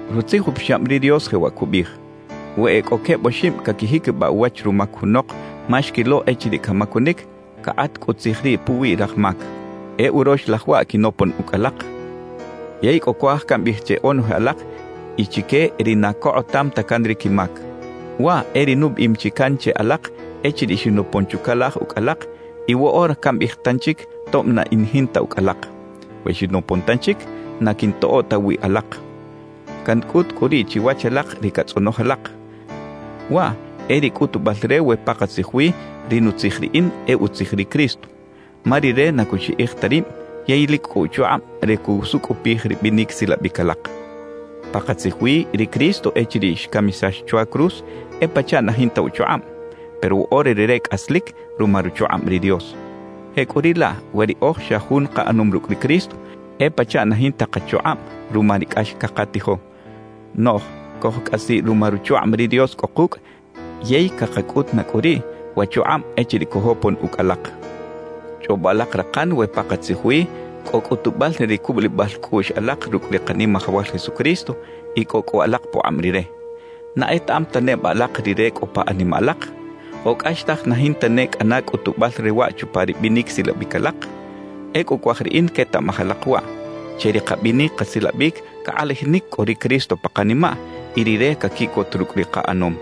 Rutzij Upixab ri Dios jewaꞌ cubiꞌij: «We e cꞌo queb oxib caquijiquibaꞌ uwach rumac junok ma xquilo echiriꞌ camacunic, cakꞌat cꞌu tzij riꞌ puwi raj mac.» E urox laj waꞌ quinopon ucꞌ alak, yey cꞌo cuaj cambiꞌij che onoje alak y chique ri na cokꞌotam ta can ri quimac. Waꞌ e ri nubiꞌim chi can che alak echiriꞌ xinopon chucalaj ucꞌ alak y woꞌora cambiꞌij tanchic tob na in jinta ucꞌ alak: We xinopon tanchic, na quiꞌntoꞌo ta wiꞌ alak. Cancꞌut cꞌu riꞌ chiwach alak ri catzꞌonoj alak, waꞌ e ri cꞌutubal re we pakatzij wi ri nutzij riꞌin e utzij ri Cristo. Ma Rire na cuxiꞌij ta rib yey lic cꞌo uchukꞌab re cusucꞌupij ri binic silabic alak. Pakatzij wi ri Cristo echiriꞌ xcamisax chwa cruz e pachaꞌ na jinta uchukꞌab, pero woꞌora Rire cꞌaslic ruma ruchukꞌab ri Dios. Jecꞌuriꞌlaꞌ we riꞌoj xa jun kaꞌanom rucꞌ ri Cristo, e pachaꞌ na jinta kachukꞌab ruma ri cꞌax cakatijo, noꞌj cojcꞌasiꞌ ruma ruchukꞌab ri Dios cꞌo kucꞌ yey cakacꞌut na cꞌu riꞌ wa chukꞌab echiriꞌ cojopon ucꞌ alak. Chꞌobo alak rakan we pakatzij wi cꞌo cꞌutubal re ri cubulibal cꞌuꞌx alak rucꞌ ri Kanimajawal Jesucristo y cꞌo cꞌu alak pukꞌab Rire. ¿Na etaꞌam ta neba alak Rire cꞌo pa animaꞌ alak? ¿O cꞌaxtaj na jinta ne cꞌana cꞌutubal re waꞌ chupa ri binic silabic alak? Ecꞌu cuaj riꞌin quetaꞌmaj alak waꞌ: Che ri kabinic kasilabic cakꞌalajinic cꞌo ri Cristo pa kanimaꞌ y Rire caquiꞌcot rucꞌ ri kaꞌanom.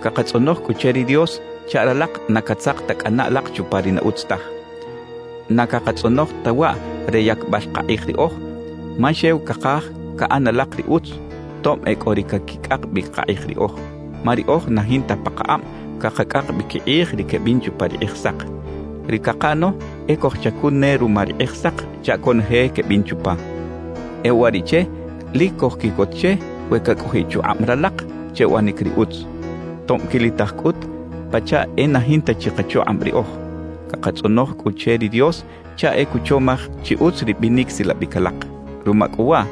Cakatzꞌonoj cꞌu che ri Dios chaꞌ ralak na catzak ta cꞌana alak chupa ri na utz taj. Na cakatzꞌonoj ta waꞌ re yacbal kakꞌij riꞌoj, ma xew cakaj caꞌan alak ri utz, tob e cꞌo ri caquicꞌak bi kakꞌij riꞌoj. Ma riꞌoj na jinta pakakꞌab cakacꞌak bi quikꞌij ri quebin chupa ri Kꞌijsak. Ri cakaꞌano e cojchacun ne ruma ri Kꞌijsak chaꞌ conoje quebin chupa. E uwariꞌche lic cojquiꞌcot che we cacꞌojiꞌ chukꞌab ralak che uꞌanic ri utz, tob quilitaj cꞌut pachaꞌ e na jinta chi kachukꞌab riꞌoj. Cakatzꞌonoj cꞌu che ri Dios chaꞌ e cuchomaj chi utz ri binic silabic alak. Ruma cꞌu waꞌ,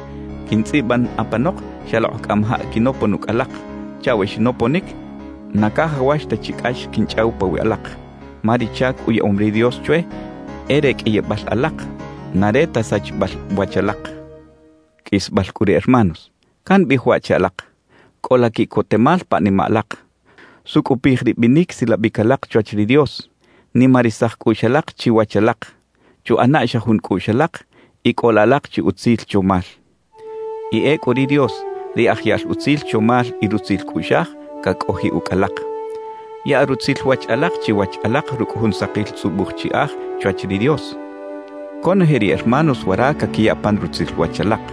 quintzꞌiban apanok xalokꞌ cꞌamajaꞌ quinopon ucꞌ alak, chaꞌ we xinoponic, na cajawax ta chi cꞌax quinchꞌaw pawiꞌ alak. Ma ri chac uyaꞌom ri Dios chwe e re qꞌuiyibal alak, na re ta sachibal wach alak. Qꞌuisbal cꞌu re hermanos, cambiꞌij waꞌ che alak: Cꞌola quiꞌcotemal pa animaꞌ alak, sucꞌupij ri binic silabic alak chwach ri Dios, nimarisaj cꞌuꞌx alak chiwach alak, chuꞌana xa jun cꞌuꞌx alak y cꞌola alak chi utzil chomal. Y ecꞌu ri Dios, ri aj yaꞌl utzil chomal y rutzil cꞌuꞌxaj, cacꞌojiꞌ ucꞌ alak. Yaꞌa rutzil wach alak chiwach alak rucꞌ jun sakil tzꞌubuj chiꞌaj chwach ri Dios. Conoje ri hermanos wara caquiya pan rutzil wach alak.